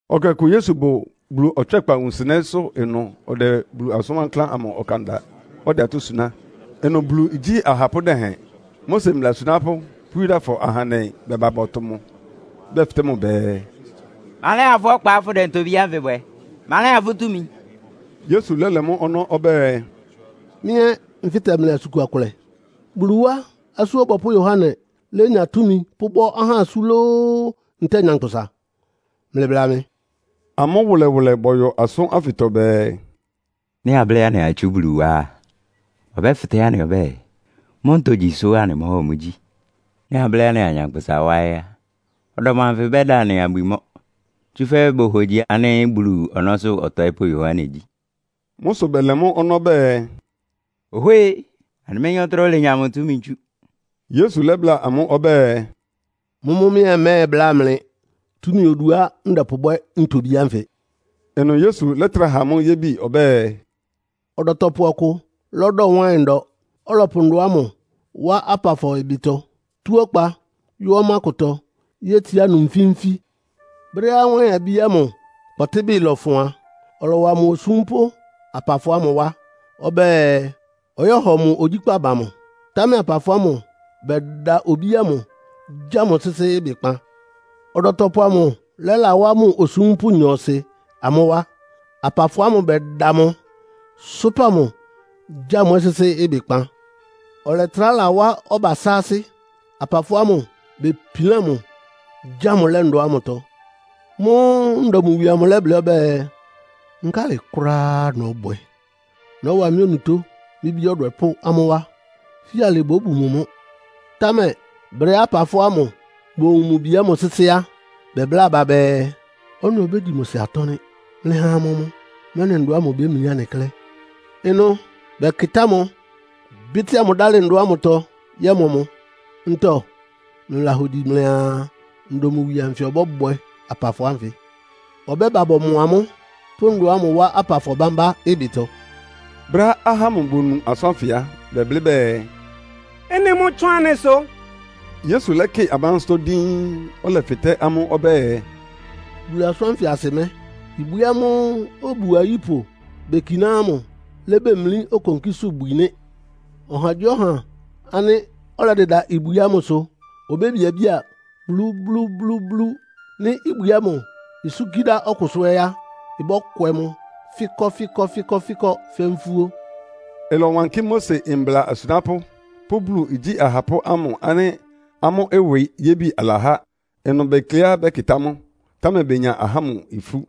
Ɛkɛ ɔkʋ Yesu bʋ Bulu ɔtswɛ́kpa wunsɩnɛ́sʋ́ ɩnʋ ɔdɛ Bulu asʋ́n wankláán ámʋ ɔkan da, ɔdɛ atɔ́ suná. Ɩnʋ Bulu igyí ahapʋ́ dɛhɛn, Mose mbla asunápʋ́ pʋ́ Yudafɔ ahandɛ bɛba bɔtʋ mʋ. Bɛfɩtɛ́ mʋ bɛɛ, “Ma lɛ́ha fʋ́ ɔkpa fʋ́dɛ ntobí ánfɩ bwɛ? Ma lɛ́ha fʋ́ túmi?” Yesu lɛ́lɛ mʋ́ ɔnɔ́ ɔbɛ́ɛ, “Mɩ́ ɛ́ nfɩ́tɛ mlɩ asʋn kua kʋlɛ. Bulu wá Asú Ɔbɔpʋ́ Yohane lénya túmi pʋ́bɔ́ ahá asú lóó, ntɛ́ɛ nyankpʋsa? Mlɩbla mɩ.” Amʋ́ wʋlɛwʋlɛ bɔyɔ asʋ́n ánfɩtɔ bɛɛ, “Nɩ́ ablɩ́ anɩaa itsú Bulu wá á, ɔbɛ́fɩtɛ́ anɩ ɔbɛ́ɛ, mʋ́ ntogyi sʋ́ anɩmɔ́hɔ mʋ gyi? Nɩ́ ablɩ́ anɩaa nyankpʋsa wá ɛ́ á, ɔdɔm anfɩ bɛ́da anɩ abwi mɔ́, tsúfɛ́ bohogyi ánɩ́ Bulu ɔnɔ́sʋ́ ɔtɔɩ́pʋ́ Yohane gyí.” Mʋ́ sʋ bɛlɛ mʋ́ ɔnɔ́ bɛɛ, “Ohwée! Anɩméyín ɔtɩ́nɛ́á olenya mʋ túmi tsú.” Yesu lɛ́bláa amʋ́ ɔbɛ́ɛ, “Mʋ́mʋ́ mɩ́ ɛ́ mmɛ́ɛbláa mlɩ túmi oduá ndɛpʋbwɛ́ ntobí ánfɩ.” Ɩnʋ Yesu lɛ́trá ha amʋ́ yébi ɔbɛ́ɛ, “Ɔdɔtɔpʋ ɔkʋ lɔ́dɔ wáɩn ndɔ, ɔlɔpʋ ndɔ ámʋ wá apafɔ ɩbɩtɔ, tú ɔkpa yɔ́ ɔmá kʋtɔ yétsiá ɩnʋ nfí-nfí. Brɛ́á wáɩn-abí ámʋ kpɔtɩ́bɩ lɔfʋn a, ɔlɔwa mʋ osúmpʋ́ apafɔ ámʋ wá ɔbɛ́ɛ, ɔyɔ́hɔ mʋ ogyíkpá ba mʋ. Támɛ apafɔ ámʋ bɛda obí ámʋ, gya mʋ sɩ́sɩ́ ɩbɩkpan. Ɔdɔtɔpʋ amʋ lɛ́lawá mʋ osúmpʋ́ nyɔɔsɩ amʋ́ wá. Apafɔ ámʋ bɛda mʋ, sʋ́pa mʋ, gya mʋ ɛ́ sɩ́sɩ́ ɩbɩkpan. Ɔlɛtrá lawá ɔba sáásɩ́. Apafɔ ámʋ bepilán mʋ, gya mʋ lɛ́ ndɔ ámʋtɔ. Mʋ́ʋ́ ndɔ mʋ wie amʋ lɛ́blɩ́ ɔbɛ́ɛ, ‘Nkálɩ kʋ́ráá nɔ́bwɛ? Nɔ́wa mɩ́ onutó mɩ́ bí ɔdwɛpʋ́ amʋ́ wá. Fíalɩ bóbu mʋ mʋ́.’ Támɛ brɛ́á apafɔ ámʋ bowun mʋ bi ámʋ sɩ́sɩ́ á, bɛbláa aba bɛɛ, ‘Ɔ́nɩ obégyi mʋ sɩ atɔ́ nɩ́. Mlɩha amɔ mʋ, mɛ́nɩ ndɔ ámʋ ibémlí anɩ klɛ́.’ Ɩnʋ bɛkɩtá mʋ, bɩ́tɩ́a mʋ dálɩ ndɔ ámʋtɔ yɔ́mɔ mʋ. “Ntɔ mlɩlahogyi mlɩaa ndɔ mʋ wie amʋ ɔbɔ́bwɛ apafɔ ánfɩ? Ɔbɛ́ba bɔmɔ amʋ́, pʋ́ ndɔ ámʋ wá apafɔ bámbá ɩbɩtɔ.” Brɛ́á ahá ámʋ bonu asʋ́n ánfɩ á, bɛblɩ́ bɛɛ, “Ɩ́nɩ mʋ́ ɩtsʋ́ʋn anɩsʋ!” Yesu lɛ́kɩ amʋ́ ansɩ́tɔ́ díín, ɔlɛfɩtɛ́ amʋ́ ɔbɛ́ɛ, “Bulu asʋ́n ánfɩ asɩ mɛ́? ‘Ibwi ámʋ́ʋ́ obu ayípʋ bekiná ámʋ lébemlí okonkísʋ́bwi nɩ́.’ Ɔhagyíɔha ánɩ́ ɔlɛdɩda ibwi ámʋsʋ obébiabía blúblúblúblú. Nɩ́ ibwi ámʋ isúnkí dá ɔkʋsʋ ɛ́ á, ɩbɔ́kwɛ mʋ fɩ́kɔ́fɩ́kɔ́fɩ́kɔ́ fɛ́ nfúó.” Ɩlɔwankɩ́ Mose mbla asunápʋ́ pʋ́ Bulu igyí ahapʋ́ amʋ ánɩ́ amʋ́ ɩwɩ yébi alahá. Ɩnʋ bekleá bɛ́kɩtá mʋ, támɛ benya ahá ámʋ ifú.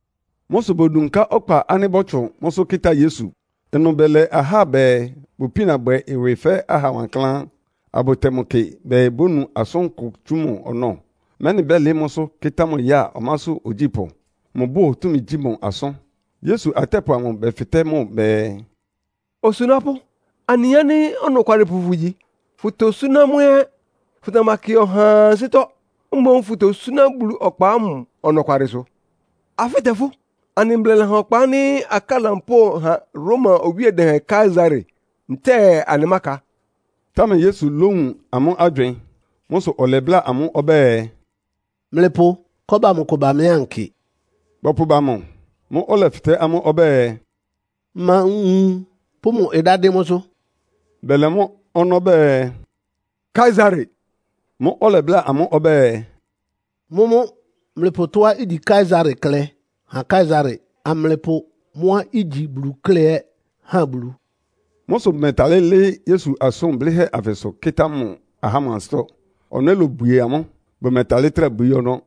Mʋ́ sʋ bodunká ɔkpa ánɩ́ bɔ́tsʋn mʋ́sʋ́ kɩ́tá Yesu. Ɩnʋ bɛlɛ ahá bɛɛ bʋpína bwɛ ɩwɩ fɛ́ aha wankláán, abʋtɛ mʋ kɩ bɛɛ bónu asʋankʋ tsú mʋ ɔnɔ́, mɛ́nɩ bɛ́lɩɩ́ mʋ́sʋ́ kɩ́tá mʋ ya ɔmásʋ́ ogyípʋ́. Mʋbʋ́ʋ túmi gyi mʋ asʋ́n. Yesu atɛ́pʋ amʋ bɛfɩtɛ́ mʋ bɛɛ, “Osunápʋ́, anɩyin ánɩ́ ɔnɔkwalɩpʋ fʋgyi, fʋ́tosúná mʋ́ ɛ́. Fʋtamakɩ ɔhaa ansɩ́tɔ́. Mboún fʋtosúná Bulu ɔkpa ámʋ ɔnɔkwalɩsʋ. Afɩ́tɛ fʋ́! Anɩ mbla lɛha ɔkpa ánɩ́ akáa lampóo ha Roma owíe dɛhɛn Kaesare, ntɛ́ɛ anɩmáka?” Támɛ Yesu lówun amʋ́ agywɩɩn. Mʋ́ sʋ ɔlɛbláa amʋ́ ɔbɛ́ɛ, “Mlɩpʋ kɔ́ba amʋ kʋ ba mɩ́ ankɩ.” Bɔpʋba mʋ. Mʋ́ʋ́ ɔlɛfɩtɛ́ amʋ́ ɔbɛ́ɛ, “Ma nwun pʋ́ mʋ ɩdá dɩ́n mʋ́sʋ́?” Bɛlɛ mʋ́ ɔnɔ́ bɛɛ, “Kaesare.” Mʋ́ʋ́ ɔlɛbláa amʋ́ ɔbɛ́ɛ, “Mʋ́mʋ́ mlɩpʋ tɔ́á igyi Kaesare klɛ́ ha Kaesare, amlɩpʋ mʋ́á igyi Bulu klɛ́ ɛ́ ha Bulu.” Mʋ́ sʋ bʋmɛtalɩ́ lɩ́ɩ́ Yesu asʋn blɩ́hɛ́ anfɩsʋ kɩ́tá mʋ ahá ámʋ ansɩ́tɔ́. Ɔnɔ́ ɛ́ lobwie amʋ́, bʋmɛtalɩ́ trá bwií ɔnɔ́.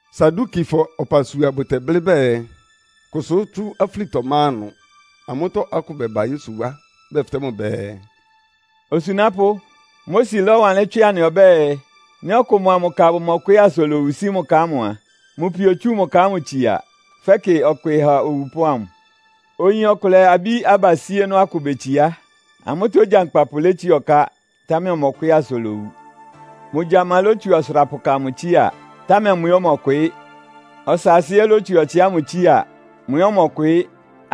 Sadukifɔ ɔpasua bʋtɛblɩ́ bɛɛ, kʋsʋ́ tsú afúlitɔ ma ɩnʋ. Amʋ́tɔ́ akʋ bɛba Yesu wá, bɛfɩtɛ́ mʋ bɛɛ, “Osunápʋ́, Mose lɔ́wanlɩ́n tswɩ anɩ ɔbɛ́ɛ, ‘Nɩ́ ɔkʋ mʋa mʋ ka bʋmɔkwɩɩ́ asa olowu sí mʋ ka ámʋ a, mʋ pio otsú mʋ ka ámʋ tsia, fɛ́kɩ ɔkwɩɩ ha owupʋ́ ámʋ.’ Oyin ɔkʋlɛ abí abasíénɔ́ akʋ betsiá. Amʋ́tɔ́ ogyankpapʋ létsiá ɔká, támɛ ɔmɔkwɩɩ́ asa olowu. Mʋ gyama lótsu ɔsʋrapʋka amʋ tsía, támɛ mʋ ɛ́ ɔmɔkwɩɩ́. Ɔsaasɩ ɛ́ lótsu ɔtsɩ ámʋ tsía. Mʋ ɛ́ ɔmɔkwɩɩ́.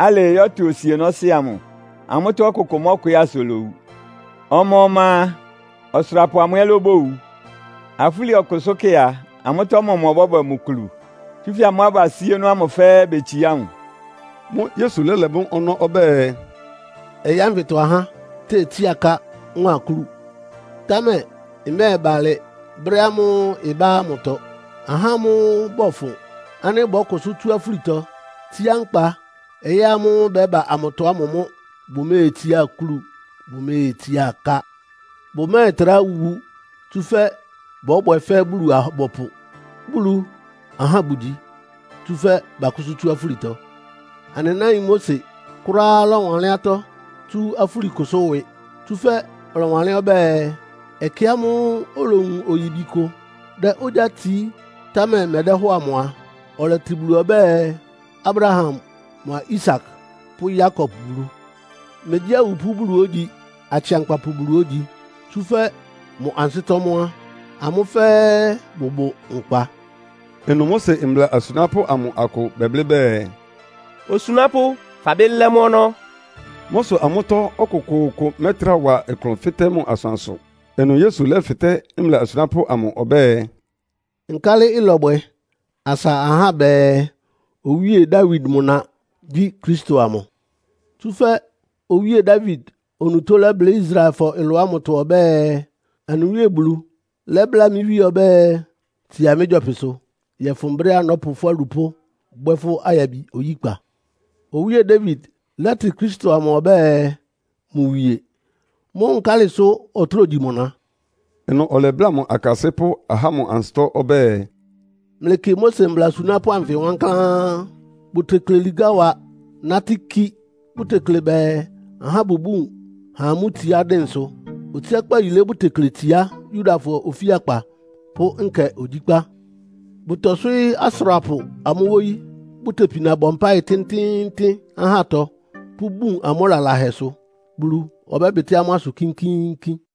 Alɩɩ yɔ́tʋ osienɔ́sɩ́ amʋ. Amʋ́tɔ́ ɔkʋkʋ mɔ́kwɩɩ́ asa olowu. Ɔma-ɔma a, ɔsʋrapʋ amʋ ɛ́ lóbowu. Afúli ɔkʋsʋ́kɛ́ a, amʋ́tɔ́ ɔmɔmʋ ɔbɔ́bwɛ mʋ kulu? Tsúfɛ́ amʋ́ abasíénɔ́ ámʋ fɛ́ɛ́ betsiá mʋ.” Mʋ́ʋ́ Yesu lɛ́lɛ mʋ́ ɔnɔ́ ɔbɛ́ɛ, “Ɔyɩ́ ánfɩtɔ ahá tétsía aká mʋ́a akúlu. Támɛ ɩmɛ́ɛba alɩ brɛ́ ámʋ́ʋ́ ɩbá ámʋtɔ. Ahá ámʋ́ʋ́ bɔfʋn ánɩ́ bɔ́kʋsʋ́ tsú afúlitɔ, tsíá nkpa ɔyɩ́ ámʋ́ʋ́ ɩbɛ́ba amʋtɔ ámʋ mʋ́ bʋméetsiá akúlu, bʋméetsiá aká. Bʋmɛ́ɛtrá wu, tsúfɛ́ bɔ́bwɛ fɛ́ Bulu-abɔpʋ. Bulu ahá bʋgyi, tsúfɛ́ bakʋ́sʋ́ tsú afúlitɔ. Anɩ náin Mose kʋ́ráá lɔ́wanlɩ́n atɔ́ tsú afúlikʋsʋ́ ɩwɩ. Tsúfɛ́ ɔlɔwanlɩ́n ɔbɛ́ɛ, ɛkɛ ámʋ́ʋ́ olowun oyíbi kʋ dɛ ogyá tsií, támɛ ɩmɛdɛ́hɔ́ɔ amʋ a, ɔlɛtɩ Bulu ɔbɛ́ɛ, ‘Abraham mʋa Isak pʋ́ Yakob Bulu.’ Megyí awupʋ́ Bulu ógyi, akɩankpapʋ Bulu ógyi, tsúfɛ́ mʋ ansɩ́tɔ́ mʋ́ á, amʋ́ fɛ́ɛ́ bʋbʋ nkpa.” Ɩnʋ Mose mbla asunápʋ́ amʋ akʋ bɛblɩ́ bɛɛ, “Osunápʋ́, fabɩ́ lɛ́ mʋ́ ɔnɔ́!” Mʋ́ sʋ amʋ́tɔ́ ɔkʋkʋʋkʋ mɛ́trá wa klʋn fɩtɛ́ mʋ asʋansʋ. Ɩnʋ Yesu lɛ́fɩtɛ́ mbla asunápʋ́ amʋ ɔbɛ́ɛ, “Nkálɩ ɩlɔbwɛ asa ahá bɛɛ, Owíe Dawid mʋ na gyí Kristo amʋ? Tsúfɛ́ owíe Dawid onutó lɛ́blɩ́ Israelfɔ ɩlʋ ámʋtɔ ɔbɛ́ɛ, ‘Anɩ Wíe Bulu lɛ́bláa mɩ́ Wíe ɔbɛ́ɛ, Tsia mɩ́ gyɔpɩsʋ, yɔ́fʋn brɛ́á nɔ́pʋ fʋ́ alupʋ́ bwɛ́ fʋ́ ayabi oyíkpa.’ Owíe Dawid lɛ́tɩ Kristo amʋ ɔbɛ́ɛ, mʋ wie. Mʋ́ nkálɩ sʋ ɔtráa ogyi mʋ na?” Ɩnʋ ɔlɛbláa mʋ akasɩ́pʋ́ ahá ámʋ ansɩ́tɔ́ ɔbɛ́ɛ, “Mlɩkɩ Mose mbla asunápʋ́ anfɩ wankláán. Bʋtekle ligá wa nátɩ́ kí. Bʋtekle bɛɛ ahá bʋbún ha amʋ́ itsiá dɩnsʋ. Otsiákpá yilé bʋtekle tsiá Yudafɔ ofíakpa pʋ́ nkɛ ogyíkpá. Bʋtɔswɩ́ɩ́ asʋrapʋ amʋ́ wóyí, bʋtepina bɔ mpáɩ tɩ́ntɩ́ɩ́ntɩ́n ahátɔ pʋ́bun amʋ́ lalahɛsʋ. Bulu ɔbɛ́bɩtɩ́ amʋ́ ɩsʋ kínkíínkín!”